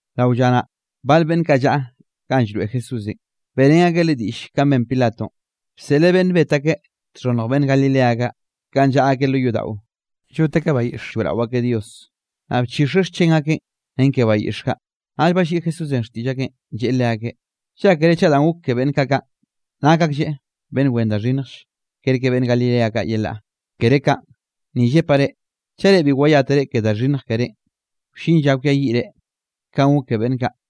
Rao lla naꞌ, bal beꞌnn kaꞌ llaꞌa ganꞌ llroeꞌ Jesúsenꞌ, beꞌrén akeꞌ Leꞌe diꞌlle kanꞌ ben Pilatonꞌ, bseꞌleꞌ beꞌnn bet akeꞌ txhonnj beꞌnn Galilea kaꞌ, kanꞌ llaꞌa akeꞌ lo yodaꞌo llot akeꞌ bayiꞌx lloeꞌrao akeꞌ Dios, naꞌ bchixeꞌ xchen akeꞌn ren ke bayiꞌx kaꞌ. Naꞌll balliꞌi Jesúsenꞌ xtiꞌll akeꞌn, lleꞌe leakeꞌ: —Llákere chaꞌ danꞌ gok ke beꞌnn kaꞌ kaꞌn, nak aklleꞌ beꞌnn wen da xhinnjll, kerke beꞌnn Galilea kaꞌ yelaꞌ. Kere kaꞌn; ni llepaꞌ reꞌ, chaꞌ reꞌ bi wayátere ke da xhinnj kerénꞌ, wllin lla kwiayiꞌre kanꞌ gok ke beꞌnn kaꞌ.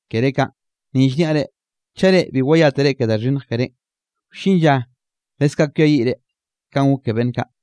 Kere kaꞌn; ni llniaꞌ reꞌ, chaꞌ reꞌ bi wayátere ke da xhinnj kerénꞌ, wllin lla leskaꞌ kwiayiꞌre kanꞌ gok ke beꞌnn kaꞌ.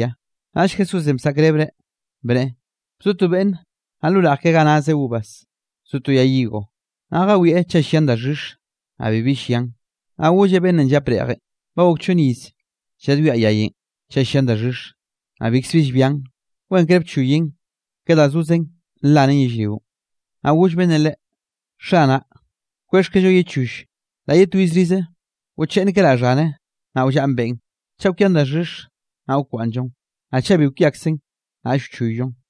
Naꞌll Jesúsenꞌ bsaꞌkrebreꞌ bneꞌe: —Bzo to beꞌnne, naꞌ lo reꞌj keꞌe ga nazeꞌ uvas, zo to yay higo; naꞌ jawieꞌ chaꞌ llian daxhix, naꞌ bibi llian. Naꞌ golleꞌ beꞌnnenꞌ llap reꞌjenꞌ: “Ba gok chonn iz lladwiaꞌ yayenꞌ chaꞌ llian daxhix, naꞌ bikzbi llbian; wenkre bchoyen, ke da zozen nlanen yellrionꞌ.” Naꞌ goll beꞌnnenꞌ leꞌe: “Xanaꞌ kwexhkello ye choll, la ye twiz rize; wcheꞌnnkeraꞌ xhane, naꞌ wllaꞌn beꞌn. Chaꞌ kwian daxhix, naꞌ wkwaꞌnnllon, naꞌ chaꞌ bi kwiakzen, naꞌll wchoyllon.”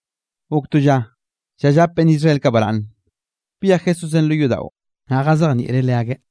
Gok to lla, lla llap beꞌnn Israel kaꞌ baraꞌnne, byej Jesúsenꞌ lo yodaꞌon, naꞌ jazejnieꞌreꞌ leakeꞌ.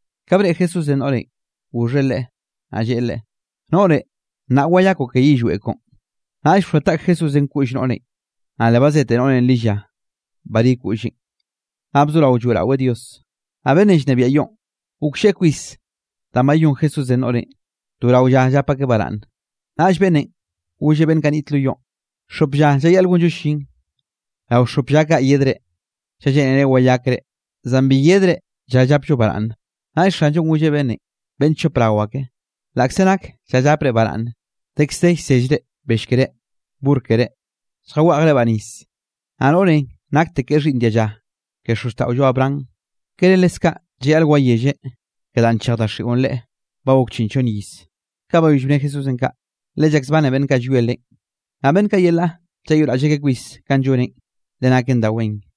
Ka breꞌe Jesúsenꞌ noꞌrenꞌ, goxheꞌ leꞌe, naꞌ lleꞌe leꞌe: —Noꞌre, nnaꞌ wayakoꞌ ke yillweꞌ koꞌon. Naꞌll bxoa taꞌk Jesúsenꞌ koꞌll noꞌrenꞌ, naꞌ le bazete noꞌrenꞌ lilla barí koꞌlleꞌn. Naꞌ bzorao lloeꞌraweꞌ Dios. Naꞌ beꞌnnenꞌ llnebiaꞌ yoꞌn, goklleꞌe kwis danꞌ bayón Jesúsenꞌ noꞌrenꞌ to rao lla llap akeꞌ baraꞌnne. Naꞌll beꞌnnenꞌ golleꞌ beꞌnn kaꞌ niꞌt lo yoꞌn: —Xop lla llayaꞌl gonllo llin; rao xop lla kaꞌ yedre, chaꞌ lleꞌnere wayakre, zan bi yedre lla llapllo baraꞌnne. Naꞌll Xanllonꞌ golleꞌ beꞌnnenꞌ: —¡Beꞌnn chop rao ake! Laꞌkze nak lla llapre baraꞌnne, dekz de llsellre bell keré, burr keré, lljaweꞌjrebaꞌ nis. Naꞌ noꞌrenꞌ naktekeꞌ xhiꞌnn dialla ke xozxtaꞌollo, Abraham, ¿kere leskaꞌ llayaꞌl wayelle ke danꞌ nchej daxiꞌon leꞌe ba gok chiꞌn chonn iz? Ka bayoll bne Jesúsenꞌ kaꞌ, le llakzbane beꞌnn kaꞌ llwie Leꞌen. Naꞌ beꞌnn kaꞌ yelaꞌ llayoꞌraꞌll akeꞌ kwis kanꞌ lloneꞌn, le naken da wen.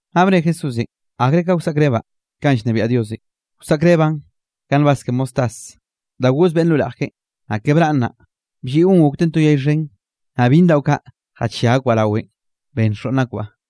Naꞌ bne Jesúsenꞌ: —¿Akre ka wsaꞌkrebaꞌ kanꞌ llnebiaꞌ Diosenꞌ? Wsaꞌkrebaꞌn ka nbaz ke mostaz da goz beꞌnn lo reꞌj keꞌen, naꞌ ke braꞌn naꞌ, blliꞌon gokten to yay xhen, naꞌ byinn daꞌo kaꞌ jachia akbaꞌ rawen, ben xoꞌnn akbaꞌ.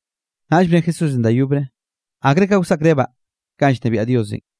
Naꞌll bne Jesúsenꞌ da yobre: —¿Akre ka wsaꞌkrebaꞌ kanꞌ llnebiaꞌ Diosenꞌ?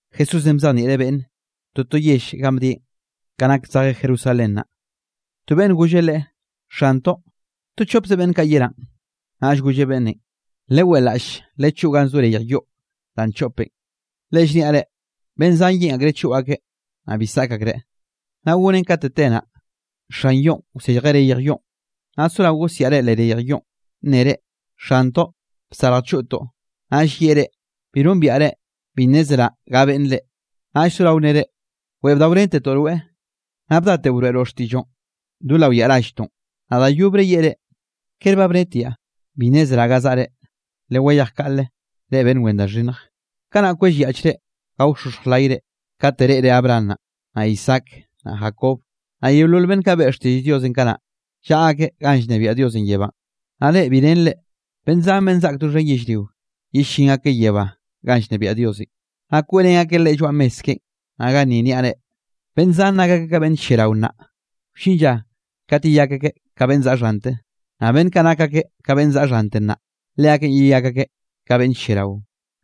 Jesúsenꞌ bzejnieꞌreꞌ beꞌnne toto yell ganꞌ bdieꞌn, ka nak zejeꞌ Jerusalén naꞌ. To beꞌnn golleꞌ Leꞌe: —Xantoꞌ, ¿to chopze beꞌnn kaꞌ yeránꞌ? Naꞌll golleꞌ beꞌnnenꞌ: —Leweꞌlaꞌll, lechoꞌo gan zo reyj yoꞌ danꞌ nchoꞌpen, le llniaꞌ reꞌ, beꞌnn zan yeꞌn akreꞌ choꞌ akeꞌ, naꞌ bi saꞌk akreꞌ. Naꞌ gonen kate te naꞌ, xan yoꞌn wsejeꞌ reyj yoꞌn, naꞌ sorao gosiaꞌre leꞌ reyj yoꞌn, nnere: “Xantoꞌ, bsarj choꞌtoꞌ.” Naꞌll yeꞌe reꞌ: “Bi nombiaꞌ reꞌ, bi nnezraꞌ ga beꞌnne reꞌ.” Naꞌll sorao nnere: “Weꞌe bdaorentetoꞌ rweꞌ, naꞌ bdateꞌo broeꞌroꞌ xtiꞌlloꞌn do lao yaꞌa ralltoꞌn.” Naꞌ da yobre yeꞌe reꞌ: “¿Kere ba bnetiaꞌ, bi nnezraꞌ ga zaꞌre? Lewayej kaꞌle, reꞌ beꞌnn wen da xhinnj.” Kanaꞌ kwellyaꞌchre, gaoxoxj layre kate reꞌre Abraham naꞌ, naꞌ Isaac, naꞌ Jacob, naꞌ yeolol beꞌnn kaꞌ beꞌe xtiꞌll Diosenꞌ kanaꞌ, llaꞌa akeꞌ ganꞌ llnebiaꞌ Diosenꞌ yebánꞌ; naꞌ reꞌ bi renre. Beꞌnn zan beꞌnn zaꞌk doxhen yellrio, yellín akeꞌ yebá ganꞌ llnebiaꞌ Diosenꞌ, naꞌ kweꞌrén akeꞌ Leꞌe lloaꞌ mes keꞌen. Naꞌ ganni niaꞌ reꞌ, beꞌnn zan nak akeꞌ ka beꞌnn lliarao nnaꞌ, wllin lla kat yeyak akeꞌ ka beꞌnn zaꞌa xhante, naꞌ beꞌnn kaꞌ nak akeꞌ ka beꞌnn zaꞌa xhante nnaꞌ, leakeꞌn yeyak akeꞌ ka beꞌnn lliarao.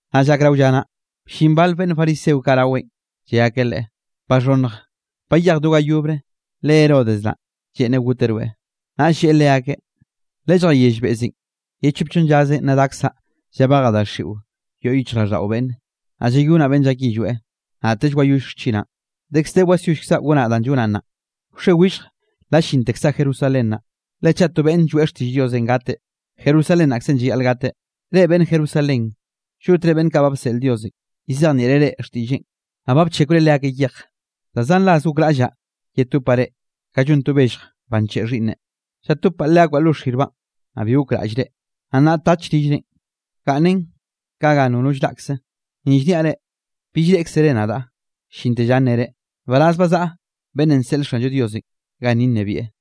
Naꞌ llak rao lla naꞌ, bllin bal beꞌnn fariseo kaꞌ raweꞌn, lle akeꞌ Leꞌe: —Baxhonnj, bayej do ga yobre, le Herodes naꞌ, lleꞌnreꞌ goteꞌ rweꞌ. Naꞌ lleꞌe leakeꞌ: —Lelljayell beꞌzenꞌ: “Ye chop chonn llazenꞌ nna dakzaꞌ llabejaꞌ daxiꞌo yoꞌ yichjraꞌlldaꞌo beꞌnne, naꞌ llayonaꞌ beꞌnn llak yillweꞌ, naꞌtell wayoll xchinaꞌn.” Dekz de wasyollkzaꞌ gonaꞌ danꞌ llonaꞌn nnaꞌ, wxe, willj la llintekzaꞌ Jerusalén naꞌ, le chaꞌ to beꞌnn lloeꞌ xtiꞌll Diosenꞌ gateꞌ, Jerusalén naꞌkze llayaꞌl gateꞌ. ’Reꞌ beꞌnn Jerusalén, llotre beꞌnn kaꞌ ba bseꞌl Diosenꞌ lladzejnieꞌre reꞌ xtiꞌlleꞌn, naꞌ ba bchekwre leakeꞌ yej. Da zan ras gokraꞌllaꞌ yetopaꞌ reꞌ, ka llon to bellj ba ncheꞌe xhiꞌnne, llatobbaꞌ leakbaꞌ lo xirbaꞌn, naꞌ bi gokraꞌllre. Naꞌ nnaꞌ tach rillrenꞌ, gaꞌnnen ka ga nono llraꞌkze. Ni llniaꞌ reꞌ, bill reꞌkzere nadaꞌ llinte lla nnere: “Nbaraz ba zaꞌa beꞌnnenꞌ nseꞌl Xanllo Diosenꞌ ganni nnebieꞌ.”